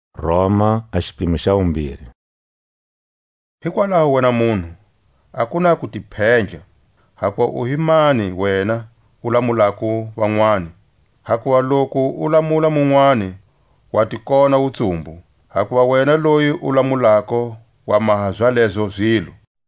A kulamula. Hikwalaho wena munhu a ku na ku ti phendla, hambu u hi mani wena u lamulako vanwani; hakuva loku u lamula munwani wa ti kona wutsumbu, hakuva wena loyi u lamulako wa maha zalezo zilo.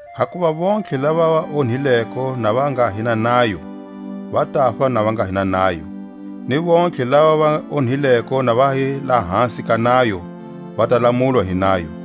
Hakuva vontlhe lava va onhileko na va nga hi na nayo, va tafa na va nga ni na nayo; ni vontlhe lava va onhileko na va hi lahasi ka nayo, va ta lamulwa hi nayo.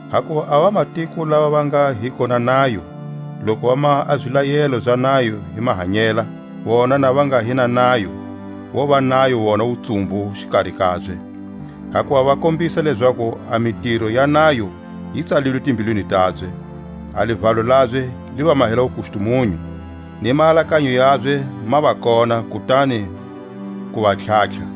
Hakuva a vamatiko lava va nga hiko na nayo, loku va maha a zilayelo za nayo hi mahanyela, vona na va nga hi na nayo, vova nayo vona wutsumbu xikari kabye; hakuva va kombisa lezaku a mitiro ya nayo yi tsalilwe timbilwini tabye, a livalo labye li va mahela wukustumunyu, ni maalakanyo yabye ma va kona kutani ku va tlhatlha.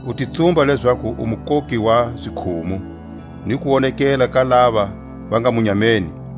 u ti tsumba lezaku u mukoki wa zikhumu, ni kuwonekela ka lava va nga munyameni,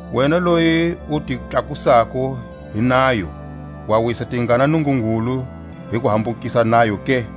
Wena loyi u ti tlakusako hi nayo, wa wisa tingana Nungungulu hi ku hambukisa a nayo ke?